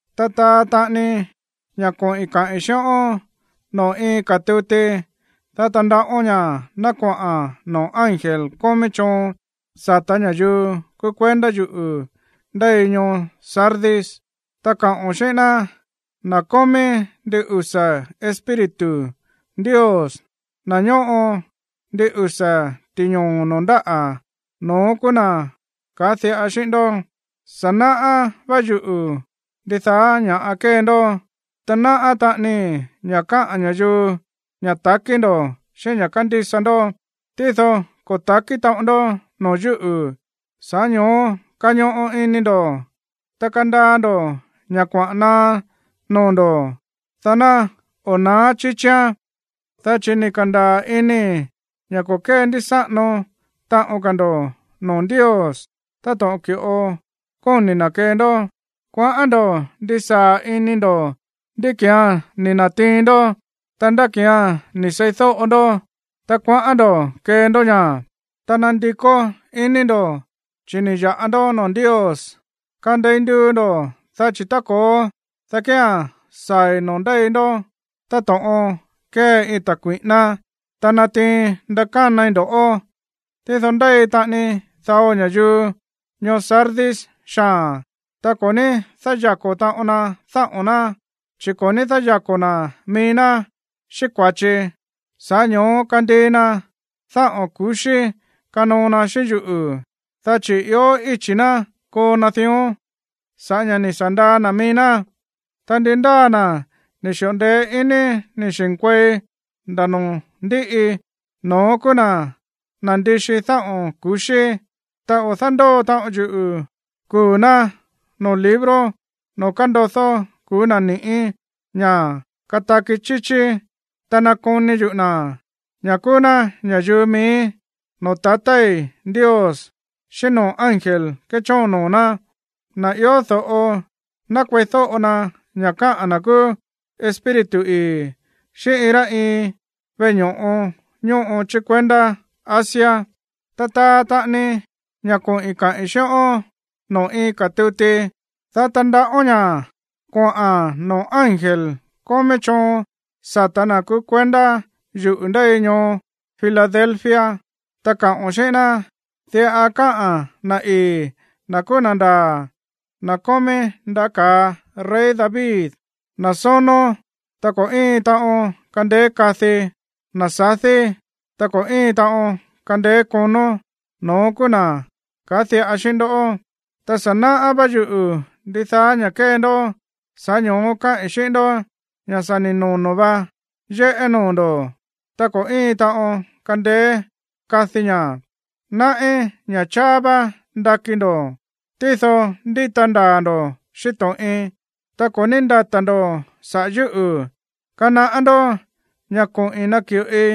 ’Ta taa taꞌani ña̱ koꞌi̱n kaꞌi̱n xíꞌón noo̱ iin ka̱ tuti, dá tandaꞌón ña̱ ná koꞌa̱n noo̱ ángel kómí choon sa̱tá ña̱yuu kúú kuendá yuꞌu̱ ndéi ñoo Sardis, ta kaꞌo̱n xíꞌín ná: “Na̱ kómí ndin usa̱ espíritu Ndios, na̱ ñóꞌo ndin usa̱ ti̱ñoo̱ noo̱ ndáꞌa̱, no̱ón kúú na̱ kaá diꞌa xíꞌín ndó: Sa̱ náꞌá vá yuꞌu̱ ndidaá ña̱ kée ndó, ta náꞌá taꞌanii ña̱ kaá ña̱yuu ña̱ takí ndo̱ xíꞌín ña̱ kándísa ndó, tído ko̱ ta̱kí taꞌon ndó noo̱ yúꞌu̱. Sa̱ꞌá ño̱ó kañoꞌo ini ndo̱, ta kandaa ndo̱ ña̱ kuaꞌa̱n naá noo̱ ndo̱, dá ná o̱ na̱á chíchíán, dá chi̱ ni̱ ka̱ndaa̱ inii̱ ña̱ ko̱ kéndísáꞌano taꞌon ka̱ ndo̱ noo̱ Ndios táto̱ꞌon ki̱ꞌo kóni̱ na̱ kee ndó. Kuaꞌán ndo̱ ndisaa̱ ini ndo̱ ndá ki̱án ni̱ na̱tiin ndó, ta ndá ki̱án ni̱ seídóꞌo ndó, ta kuaꞌán ndo̱ kee ndó ña̱, ta nandikó iní ndo̱, chi̱ ni̱ ya̱ꞌa ndó noo̱ Ndios. Kandei nduu ndo̱, dá chi̱ tá ko̱ó, dá kía̱n saa̱i̱ noo̱ ndéi ndó táto̱ꞌon kée iin ta̱ kui̱ꞌíná, ta natiin ndakánai ndo̱ꞌó. Tído ndéi taꞌani dao ña̱yuu ñoo Sardis xaa̱n, ta ko̱ ní dáyako̱ taꞌon na dáꞌo̱n ná, chi̱ ko̱ ní dáyako̱ na̱ mií ná xíꞌín kua̱chi. Sa̱ꞌá ño̱ó kandii na dáꞌo̱n ku̱xí kanoo na xíꞌín yuꞌu̱, dá chi̱ ió íchi̱ ná koo na dión sa̱ꞌá ña̱ ni̱ sa̱ ndaa na̱ mií ná. Ta ndi ndáa na̱ ni̱ xi̱ꞌo ndeé iní ni̱ xi̱nkuei nda̱ noo̱ ndíꞌi, no̱ón kúú na̱ nandixi dáꞌo̱n ku̱xí, ta o̱ dándóo taꞌon yuꞌu̱ kuu̱ ná noo̱ libro noo̱ kándodó kuu̱ na̱ ni̱ꞌí ña̱ kataki chíchí, ta nakoni yuꞌu̱ na̱, ña̱ kúú ná ña̱yuu miíí, noo̱ tatái̱ Ndios xíꞌín noo̱ ángel kéchóon noo̱ ná. Na̱ ió do̱ꞌo, ná kueídóꞌo na ña̱ káꞌa̱n na̱ kúú Espíritu ii̱ xíꞌín iin rá iin veꞌe ño̱ꞌo ñóꞌo chí kuendá Asia.” ’Ta taa taꞌani ña̱ koꞌi̱n kaꞌi̱n xíꞌón noo̱ iin ka̱ tuti, dá tandaꞌón ña̱ koꞌa̱n noo̱ ángel kómí choon sa̱tá na̱ kúú kuendá yuꞌu̱ ndéi ñoo Filadelfia, ta kaao̱n xíꞌín ná: “Diꞌa káꞌa̱n na̱ ii̱, na̱ kúú na̱ ndaa̱, na̱ kómí ndaꞌá ka̱a rey David, na̱ sónó, ta ko̱ íin taꞌon kandeé kadi, na̱ sadí, ta ko̱ íin taꞌon kandeé konó, no̱ón kúú na̱ kaá diꞌa xíꞌín ndó: Ta sa̱ náꞌá vá yuꞌu̱ ndidaá ña̱ kée ndó. Sa̱ꞌá ño̱ó kaái̱ xíꞌín ndó ña̱ sa̱ ni̱ nono̱ vá yéꞌé noo̱ ndo̱, ta ko̱ íin taꞌon kandeé kadi ña̱. Náꞌí ña̱ cháá vá ndakí ndo̱, tído ndíta ndaa̱ ndo̱ xíꞌín to̱ꞌin, ta ko̱ ní ndata̱ ndo̱ saꞌa̱ yúꞌu̱. Kanaꞌá ndó ña̱ koꞌi̱n naki̱ꞌoi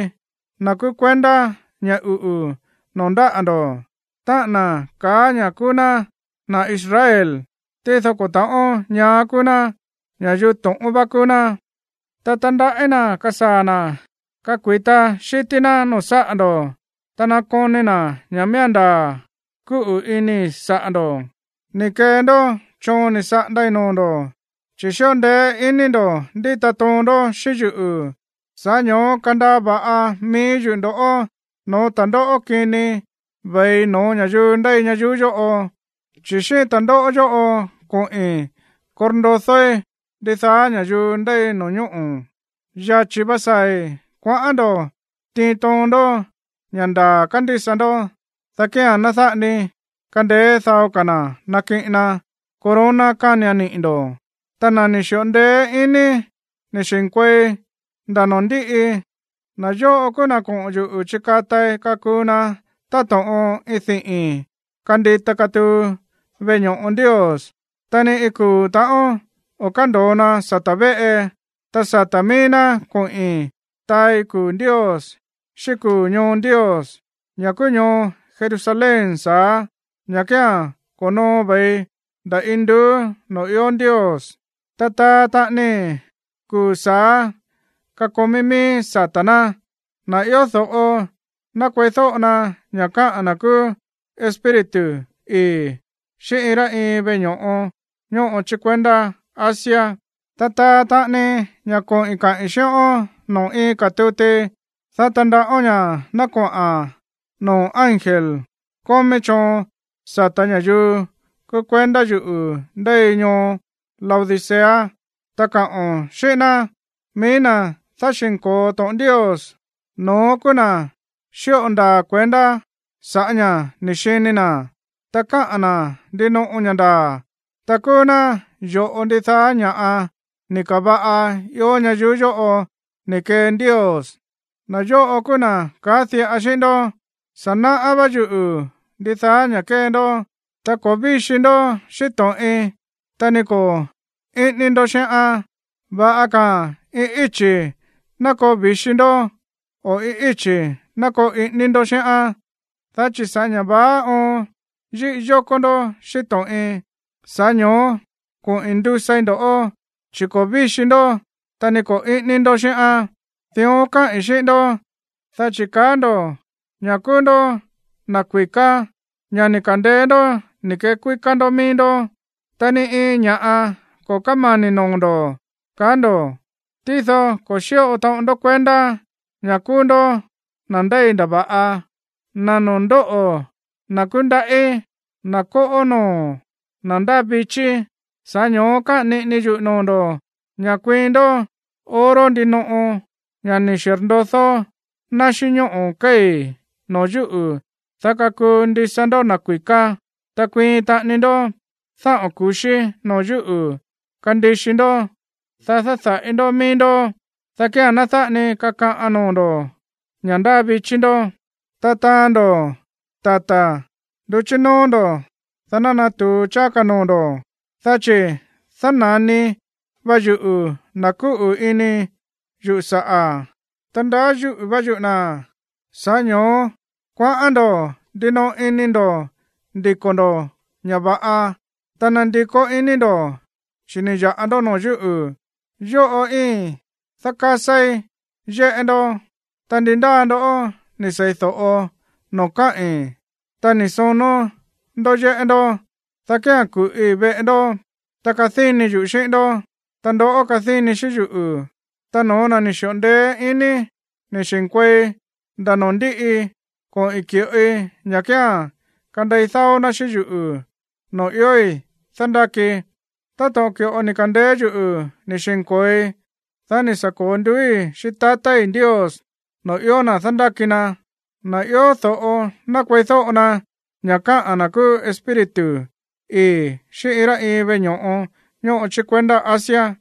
na̱ kúú kuendá ña̱ uꞌu̱ noo̱ ndáꞌa̱ ndo̱, táꞌa̱n na̱ kaá ña̱ kúú ná na̱ Israel, tído ko̱ ta̱ꞌón ñaá kúú ná, ña̱yuu to̱ꞌón vá kúú ná. Ta tandaꞌí na̱ kasaa̱ na̱ kakui̱ta xi̱tí ná no̱ó saꞌa̱ ndo̱, ta nakoni na̱ ña̱ miía̱n ndaa̱ kúꞌu̱ inii̱ saꞌa̱ ndo̱. Ni̱ kee ndó choon ni̱ saꞌandai̱ noo̱ ndo̱, chi̱ xíꞌo ndeé iní ndo̱ ndíta toon ndó xíꞌín yuꞌu̱, sa̱ꞌá ño̱ó kandaa va̱ꞌa mií yuꞌu̱ ndo̱ꞌó no̱ó ta̱ndóꞌó kini ve̱i no̱ó ña̱yuu ndéi ñayuú yóꞌo, chi̱ xíꞌín ta̱ndóꞌó yóꞌo koꞌi̱n korndodóí ndidaá ña̱yuu ndéi no̱ñóꞌo̱. Yachi̱ vá saa̱i̱. Kuaꞌán ndo̱ tiin toon ndó ña̱ ndaa̱ kándísa ndó, dá kía̱n ná dáꞌa ni kandeé dao ka̱ na̱ nakiꞌin na corona kánian niꞌi̱ ndo̱. Ta na̱ ni̱ xi̱ꞌo ndeé iní ni̱ xi̱nkuei nda̱ noo̱ ndíꞌi, na̱ yóꞌo kúú na̱ koꞌo̱n yuꞌu̱ chikatai kakuu na táto̱ꞌon iin diꞌi̱n kandita katuu veꞌe ño̱ꞌo Ndios, ta ni iin kuu̱ ta̱ꞌón o̱ kándo̱o na sata̱ véꞌe. Ta sata̱ mií ná koꞌi̱n taai kuu̱ Ndios xíꞌín kuu̱ ñoo Ndios, ña̱ kúú ñoo Jerusalén sa̱á, ña̱ kía̱n ko̱noo ve̱i nda̱ induú noo̱ ió Ndios, ta taa taꞌanii kuu̱ sa̱á kakomí miíí sata̱ ná. Na̱ ió do̱ꞌo, ná kueídóꞌo na ña̱ káꞌa̱n na̱ kúú Espíritu ii̱ xíꞌín iin rá iin veꞌe ño̱ꞌo ñóꞌo chí kuendá Asia.” ’Ta taa taꞌani ña̱ koꞌi̱n kaꞌi̱n xíꞌón noo̱ iin ka̱ tuti, dá tandaꞌón ña̱ ná koꞌa̱n noo̱ ángel kómí choon sa̱tá ña̱yuu kúú kuendá yuꞌu̱ ndéi ñoo Laodicea, ta kaꞌo̱n xíꞌín ná: “Mií na̱ dáxi̱nko̱o to̱ꞌon Ndios, no̱ón kúú na̱ xíꞌo ndaa̱ kuendá sa̱ꞌá ña̱ ni̱ xini na̱, ta káꞌa̱n na̱ ndinoꞌo ña̱ ndaa̱, ta kúú ná yo̱ꞌo ndidaá ña̱ꞌa ni̱ ka̱va̱ꞌa ió ñayuú yóꞌo ni̱ kee Ndios, na̱ yóꞌo kúú na̱ kaá diꞌa xíꞌín ndó: Sa̱ náꞌá vá yuꞌu̱ ndidaá ña̱ kée ndó, ta ko̱ víxi ndó xíꞌín to̱ꞌin, ta ni ko̱ íꞌíní ndó xíꞌán. Va̱ꞌa ka̱a̱n iin íchi̱ ná koo vi̱xi ndó, o iin íchi̱ ná koo iꞌíní ndó xíꞌán. Dá chi̱ sa̱ꞌá ña̱ vaá óon yíꞌi yókó ndó xíꞌín to̱ꞌin, sa̱ꞌá ño̱ó koꞌi̱n ndusai ndo̱ꞌó, chi̱ ko̱ víxi ndó, ta ni ko̱ íꞌíní ndó xíꞌán. Dión kaái̱ xíꞌín ndó, dá chi̱ kaá ndo̱ ña̱ kúú ndó na̱ kui̱ká, ña̱ ni̱ ka̱ndeé ndó ni̱ kekuíká ndó mií ndó, ta ni iin ña̱ꞌa ko̱ kámani̱ noo̱ ndo̱, kaá ndo̱. Tído ko̱ xíꞌo taꞌon ndó kuendá ña̱ kúú ndó na̱ ndéi ndava̱ꞌa, na̱ noo̱ ndóꞌo̱, na̱ kúndaꞌí, na̱ kóꞌó noo̱, na̱ ndáa vichí. Sa̱ꞌá ño̱ó káꞌa̱n niꞌinii yuꞌu̱ noo̱ ndo̱ ña̱ kuiin ndó oro ndinoꞌo, ña̱ ni̱ xirndodó ná xíꞌín ñóꞌo̱ kéi̱, noo̱ yúꞌu̱, dá kakuu ndisa ndó na̱ kui̱ká, ta kuiin taꞌani ndó dáꞌo̱n ku̱xí noo̱ yúꞌu̱ kandixi ndó, dá dáda̱ꞌi ndó mií ndó, dá kía̱n ná dáꞌa ni kakaꞌan noo̱ ndo̱ ña̱ ndáa vichí ndó, ta taán ndo̱ tata nduchí nóó ndo̱, dá ná natu̱u cháá noo̱ ndo̱. Dá chi̱ dána̱ni va yuꞌu̱ na̱ kúꞌu̱ ini yuꞌu̱ saꞌa̱, ta ndaá yúꞌu̱ vá yuꞌu̱ na̱. Sa̱ꞌá ño̱ó kuaꞌán ndo̱ ndinoꞌo ini ndo̱ ndiko̱ ndo̱ ña̱ va̱ꞌa, ta nandikó iní ndo̱, chi̱ ni̱ ya̱ꞌa ndó noo̱ yúꞌu̱. Yóꞌo íin dákásáí yéꞌé ndó, ta ndi ndáa ndo̱ ni̱ seídóꞌo noo̱ káꞌi̱n, ta ni̱ sonó ndó yéꞌé ndó, dá kía̱n ku̱ꞌi veꞌe ndó, ta kadíni yuꞌu̱ xíꞌín ndó, ta ndoꞌó kadíni xíꞌín yuꞌu̱. Ta no̱ó na̱ ni̱ xi̱ꞌo ndeé iní ni̱ xi̱nkuei nda̱ noo̱ ndíꞌi, koꞌi̱n ki̱ꞌoi ña̱ kía̱n kandei dáó ná xíꞌín yuꞌu̱ noo̱ iói̱ dándákii, táto̱ꞌon ki̱ꞌo ni̱ ka̱ndeé yuꞌu̱ ni̱ xi̱nko̱oi, dá ni̱ sa̱ ko̱o nduúi̱ xíꞌín tatái̱ Ndios noo̱ ió na̱ dándáki na. Na̱ ió do̱ꞌo, ná kueídóꞌo na ña̱ káꞌa̱n na̱ kúú Espíritu ii̱ xíꞌín iin rá iin veꞌe ño̱ꞌo ñóꞌo chí kuendá Asia.”